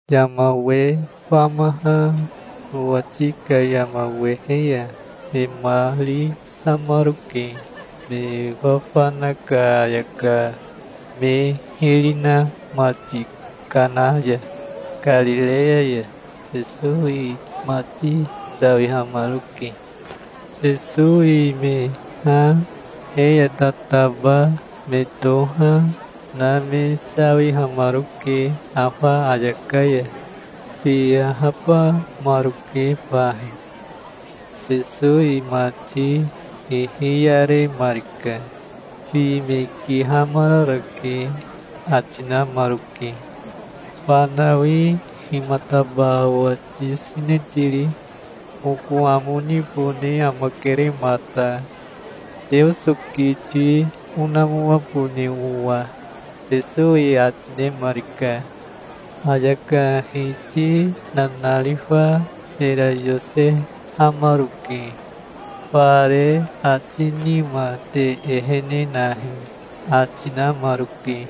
Yama we famaha nowati ka yama wehe ya me mari namaroke, me fafana ka ayaka me hiri na mati Kana ya, Karireya ya. Sesowi mati sawihamaroke. Sesowi me ha, he ya tataba me toha, na me sawihamaroke afa ayaka ya. Fi ahabamaroke fahi. Sesowi mati hihiyaremarika. "Fi me kihamararake", ati namaroke. "Fanawi himataba owa tiyosene tiri? Oko amo nibone amakere mata, Teoso kiti onamoabone owa", Sesowi ati nemarika. Ayaka hiti nanarifa mera yosehamaroke. "Fare ati nima te ehene nahi", ati namaroke.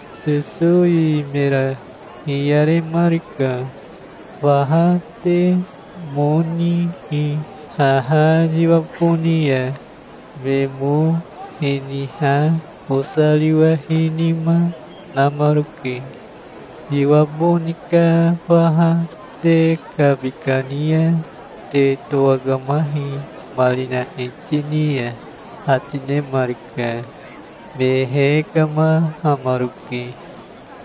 Sesowi mera hiyaremarika. "Faha te mo nihi haha yiwa boni ya". Me mo hiniha bosariwahinima namaroke. "Yiwa boni ka faha te kabi kani ya te towakamahi marina hiti ni ya", ati nemarika. Me hekamahamaroke.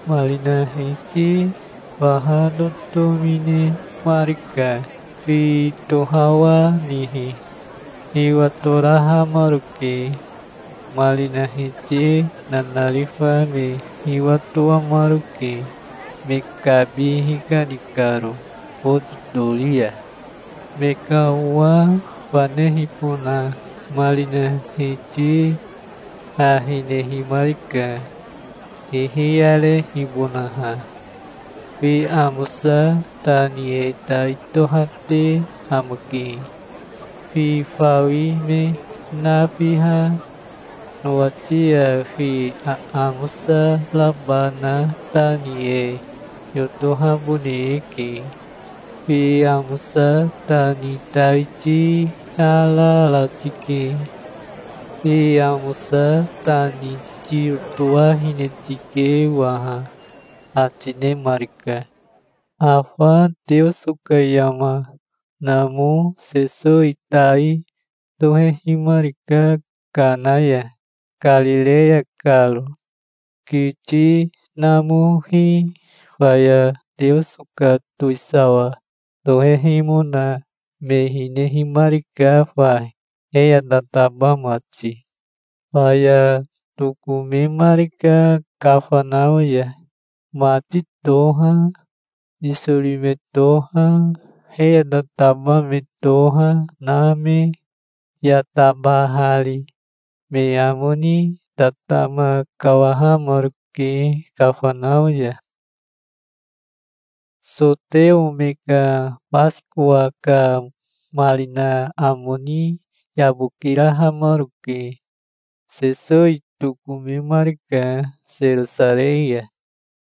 Marina hiti faha totomi nemarika, fi tohawahanihi. Hiwatorahamaroke. Marina hiti nanarifa me hiwatoamaroke, me kabi hikani karo boti tori ya. Me ka owa fanehibona marina hiti ha hinehimarika, hihiyarehibonaha. "Fi amosa ta ni e tai tohate amake. Fi fawi me nafiha nowati ya fi aamosa raba na ta ni e yotohabone eke. Fi amosa ta ni tai tiharara tike. Fi amosa ta ni tiyotowahine tike waha", ati nemarika. Afa Teoso ka yama namo Sesowi tai tohehimarika Kana ya, Karireya karo. Kiti namohi faya Teoso ka towisawa tohehimona me hinehimarika fahi, he ya tataba mati. Faya tokomemarika Kafanao ya, mati toha, nisori me toha, he ya tataba me toha na me ya tabahari. Me amo ni tatama kawahamaroke Kafanao ya. Soteo me ka Basikowa ka marina amo ni yabokirahamaroke. Sesowi tokomemarika Serosarei ya.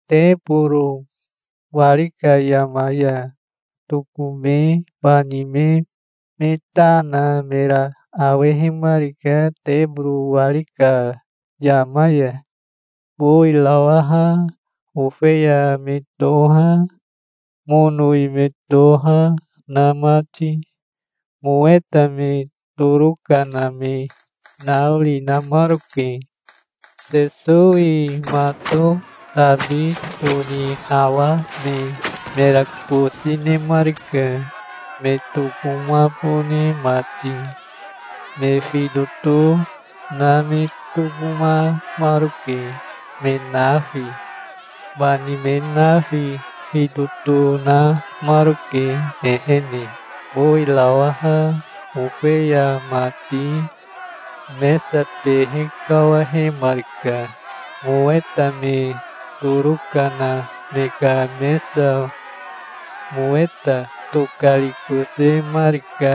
Teboro wari ka yama ya tokome bani me me ta na mera awehimarika teboro wari ka yama ya, bowirawaha, ofeya me toha, monowi me toha na mati. Moweta me toroka na me naori namaroke. Sesowi mato tabi tonihawame mera kosi nemarika, me tokomabone mati. Me fitoto na me tokomamaroke, me nafi. Bani me nafi fitoto namaroke ehene, bowirawaha, ofeya mati. Mesa behe kawahemarika, moweta me toroka na me ka mesa. Moweta tokarikosemarika,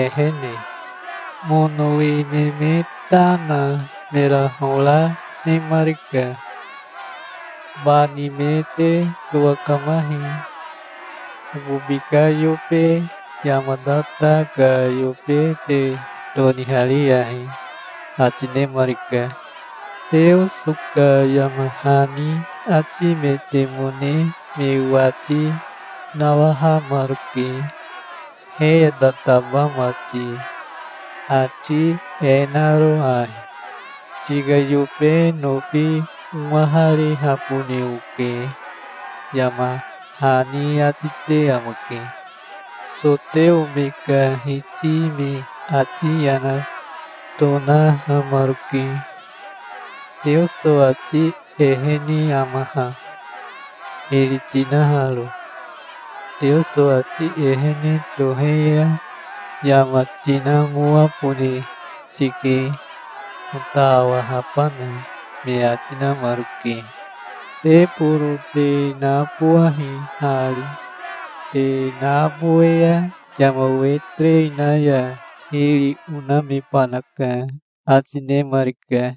ehene. Monowi me me ta na mera hora nemarika. "Bani me te towakamahi. Okobi ka yobe yama tata ka yobe te tonihariyahi", ati nemarika. Teoso ka yama hani atimetemone me wati nawahamaroke, he ya tataba mati, ati e naro ahi: "Tika yobe nofi owaharihabone oke", yama hani ati te amake. Soteo me ka hiti me ati yana tonahamaroke. "Teoso ati ehene ama ha, hiri tinaharo? Teoso ati ehene tohe ya yama tinamoabone tike, ota awahabana", me ati namaroke. "Teboro te nabowahi hari. Te nabowe ya yama we terei na ya hiri onamebanaka", ati nemarika.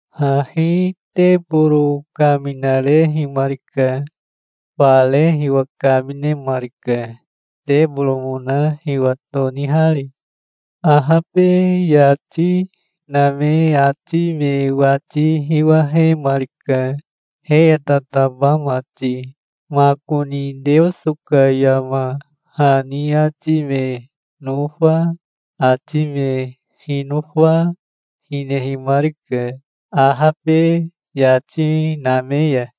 Hahi teboro kaminarehimarika. Fare hiwa kaminemarika, teboromona hiwa tonihari. Ahabe yati name ati me wati hiwahemarika, he ya tataba mati. Makoni Teoso ka yama hani ati me nofa, ati me hinofa, hinehimarika, ahabe yati name ya.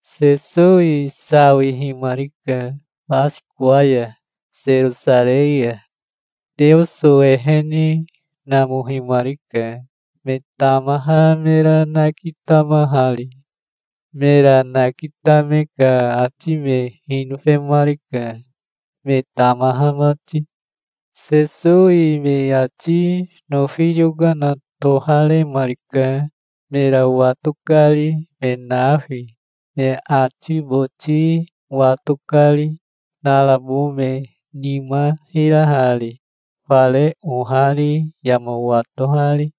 Sesowi sawihimarika Basikowa ya Serosarei ya. Teoso ehene namohimarika, me tamaha mera nakitamahari. Mera nakitame ka ati me hinofemarika, me tamaha mati. Sesowi me ati nofi yokana toharemarika, mera wato kari me nafi, me ati boti wato kari, narabo me nima hirahari, fare ohari yama watohari.